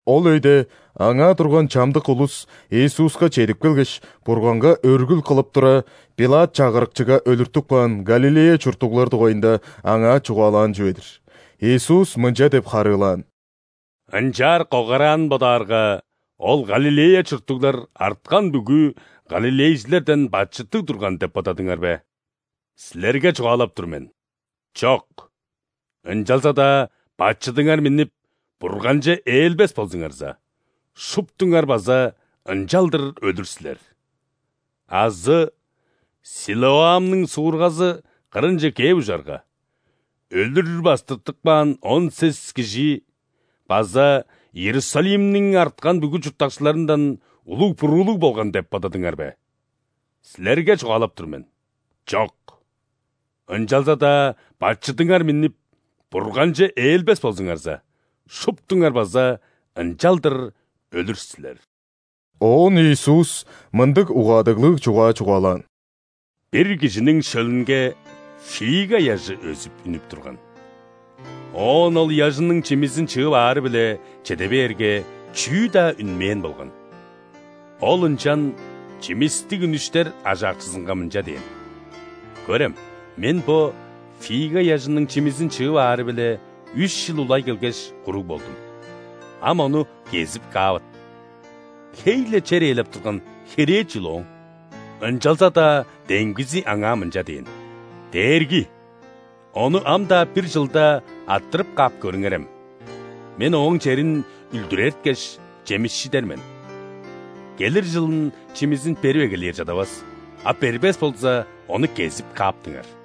Ол өйде аңаа турган чамдык улус Иисуска чедип келгеш, Бурганга өргүл кылып тура, ·Пилат чагырыкчыга өлүртүп каан Галилея чурттуглар дугайында Аңаа чугаалаан чүве-дир. Иисус мынча деп харыылаан: «Ынчаар когараанын бодаарга, ол Галилея чурттуглар арткан бүгү галилейжилерден бачыттыг турган деп бодадыңар бе? Силерге чугаалап тур мен: чок! Ынчалза-даа бачыдыңар миннип, Бурганче ээлбес болзуңарза, шуптуңар база ынчалдыр өлүр силер. Азы Силоамның суургазы кырынче кээп ужарга, өлүр бастыртып каан он сес кижи база Иерусалимниң арткан бүгү чурттакчыларындан улуг буруулуг болган деп бодадыңар бе? Силерге чугаалап тур мен: чок! Ынчалза-даа бачыдыңар миннип, Бурганче ээлбес болзуңарза, шуптуңар база ынчалдыр өлүр силер». Оон Иисус мындыг угаадыглыг чугаа чугаалаан: «Бир кижиниң шөлүнге фига ыяжы өзүп үнүп турган. Оон ол ыяжының чимизин чыып аары-биле чеде бээрге, чүү-даа үнмээн болган. Ол ынчан чимистиг үнүштер ажаакчызынга мынча дээн: „Көрем, мен бо фига ыяжының чимизин чыып аары-биле үш чыл улай келгеш, куруг болдум; ам ону кезип каавыт! Хей-ле чер ээлеп турган херээ чүл ооң?“ Ынчалза-даа демгизи аңаа мынча дээн: „Дээрги! Ону ам-даа бир чылда арттырып каап көрүңерем. Мен ооң черин үлдүрерткеш, чемишчидер мен. Келир чылын чимизин берип эгелээр чадавас, а бербес болза, ону кезип кааптыңар“».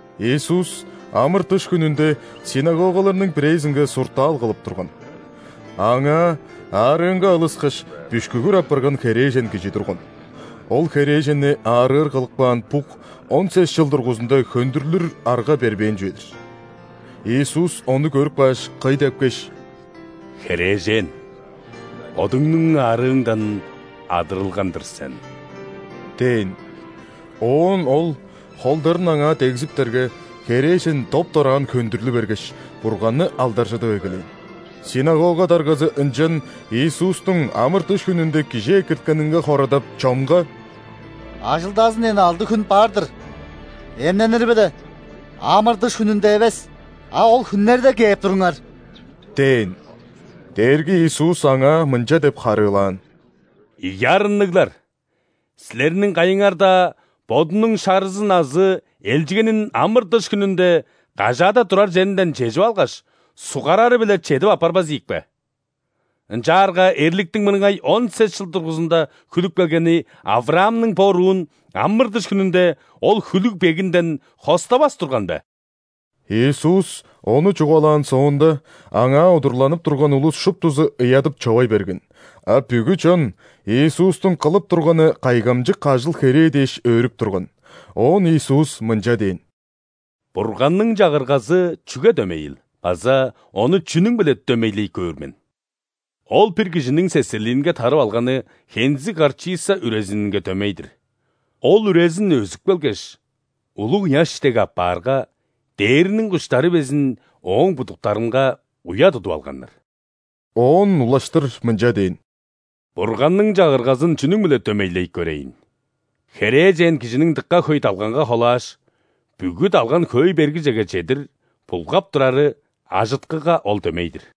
Иисус ·амыр-дыш хүнүнде ·синагогаларның бирээзинге суртаал кылып турган. Аңаа аарыынга алыскаш, бүшкүгүр апарган херээжен кижи турган. Ол херээженни аарыыр кылып каан бук он сес чыл дургузунда хөндүрлүр арга бербээн чүве-дир. Иисус ону көрүп кааш, кый депкеш: «Херээжен, бодуңнуң аарыыңдан адырылган-дыр сен» – дээн. Оон Ол холдарын аңаа дегзиптерге, херээжен доп-дораан хөндүрлү бергеш, Бурганны алдаржыдып эгелээн. Синагога даргазы ынчан Иисустуң амыр-дыш хүнүнде кижи экирткенинге хорадап, чонга: «Ажылдазын дээн алды хүн бар-дыр, эмненири-биле амыр-дыш хүнүнде эвес, а ол хүннерде кээп туруңар» – дээн. Дээрги Иисус аңаа мынча деп харыылаан: «Ийи арынныглар! Силерниң кайыңар-даа бодунуң шарызын азы элчигенин амыр-дыш хүнүнде кажаада турар черинден чежип алгаш, ·суггарары-биле чедип аппарбас ийик бе? Ынчаарга эрликтиң мырыңай он сес чыл дургузунда хүлүп келгени ·Авраамның бо уруун амыр-дыш хүнүнде ол хүлүг-бегинден хоставас турган бе?» Иисус ону чугаалаан соонда, Аңаа удурланып турган улус шуптузу ыядып-човай берген, а бүгү чон Иисустуң кылып турганы кайгамчык ажыл-херээ дээш өөрүп турган. Оон Иисус мынча дээн: «Бурганның Чагыргазы чүге дөмейил база Ону чүнүң-биле дөмейлей көөр мен? Ол бир кижиниң сесерлиинге тарып алганы хензиг горчица үрезининге дөмей-дир, ол үрезин өзүп келгеш, улуг ыяш дег апаарга, дээрниң куштары безин ооң будуктарынга уя тудуп алганнар». Оон улаштыр мынча дээн: «Бурганның Чагыргазын чүнүң-биле дөмейлей көрейн? Херээжен кижиниң дыка хөй далганга холааш, бүгү далган хөөй бергижеге чедир булгап турары ажыткыга Ол дөмей-дир».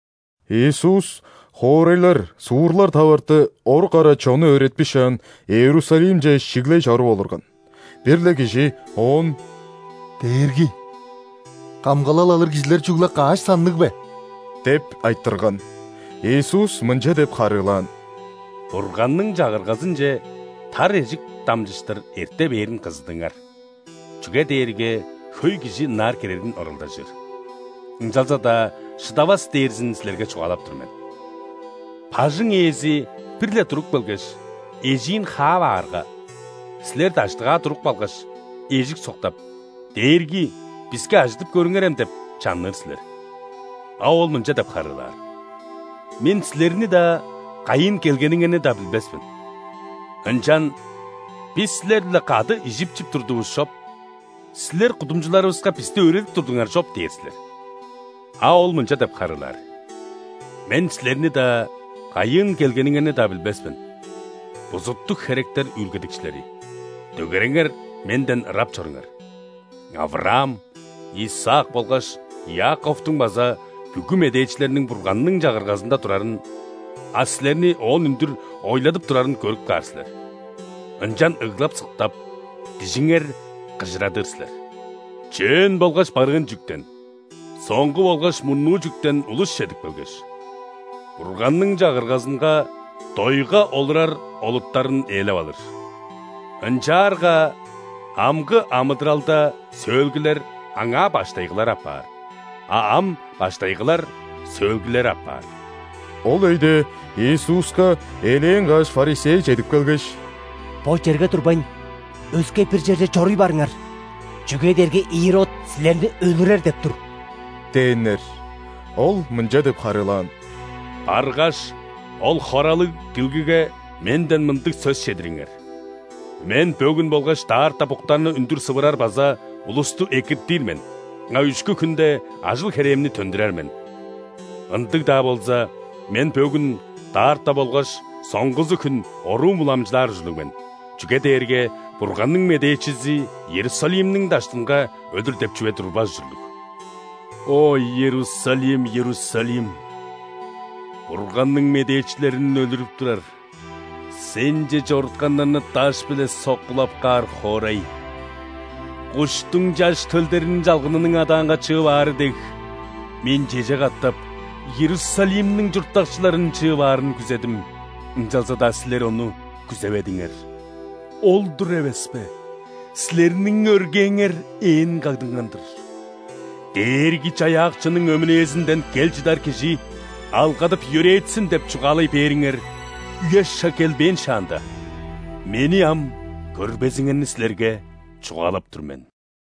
Иисус хоорайлар, суурлар таварты, орук ара чонну өөретпишаан, Иерусалимче шиглей чоруп олурган. Бир-ле кижи Оон: «Дээрги, камгалал алыр кижилер чүгле каш санныг бе?» – деп айтырган. Иисус мынча деп харыылаан: «Бурганның Чагыргазынче тар эжик дамчыштыр эрте бээрин кызыдыңар, чүге дээрге хөй кижи ынаар кирерин оралдажыр, ынчалза-даа шыдавас дээрзин силерге чугаалап тур мен. Бажың Ээзи бир-ле туруп келгеш, эжиин хаап аарга, силер даштыгаа туруп калгаш, эжик соктап: „Дээрги, биске ажыдып көрүңерем!“ – деп чанныр силер. А Ол мынча деп харыылаар: „Мен силерни-даа, кайыын келгениңерни-даа билбес мен“. Ынчан: „Бис Силер-биле кады ижип-чип турдувус чоп, Силер кудумчуларывыска бисти өөредип турдуңар чоп“ – дээр силер. А Ол мынча деп харыылаар: „Мен силерни-даа, кайыын келгениңерни-даа билбес мен, бузуттуг херектер үүлгедикчилери, дөгереңер Менден ырап чоруңар!“ Авраам, Исаак болгаш Иаковтуң база бүгү медээчилерниң Бурганның Чагыргазында турарын, а силерни Оон үндүр ойладып турарын көрүп каар силер. Ынчан ыглап-сыктап, дижиңер кыжырадыр силер. Чөөн болгаш барыын чүктен, соңгу болгаш мурнуу чүктен улус чедип келгеш, Бурганның Чагыргазынга дойга олурар олуттарын ээлеп алыр. Ынчаарга амгы амыдыралда сөөлгүлер аңаа баштайгылары апаар, а ам баштайгылар – сөөлгүлери апаар». Ол өйде Иисуска элээн каш ·фарисей чедип келгеш: «Бо черге турбайн, өске-бир черже чоруй барыңар, чүге дээрге Ирод Силерни өлүрер деп тур!» – дээннер. Ол мынча деп харыылаан: «Баргаш, ол хоралыг дилгиге Менден мындыг сөс чедириңер: „Мен бөгүн болгаш даарта буктарны үндүр сывырар база улусту экиртир мен, а үшкү хүнде ажыл-херээмни төндүрер мен“. Ындыг-даа болза, Мен бөгүн, даарта болгаш соңгузу хүн оруум уламчылаар ужурлуг мен, чүге дээрге Бурганның медээчизи Иерусалимниң даштынга өлүр деп чүве турбас ужурлуг! О, Иерусалим, Иерусалим! Бурганның медээчилерин өлүрүп турар, сенче чорутканнарны даш-биле соккулап каар хоорай! Куштуң чаш төлдерин чалгынының адаанга чыып аары дег, Мен чеже катап Иерусалимниң чурттакчыларын чыып аарын күзедим, ынчалза-даа силер ону күзеведиңер! Ол-дур эвеспе, силерниң өргээңер ээн кагдынган-дыр. „Дээрги-Чаяакчының өмүнээзинден кел чыдар Кижи алгадып-йөрээтсин!“ – деп чугаалай бээриңер үе-шаг келбээн шаанда, Мени ам көрбезиңерни силерге чугаалап тур мен».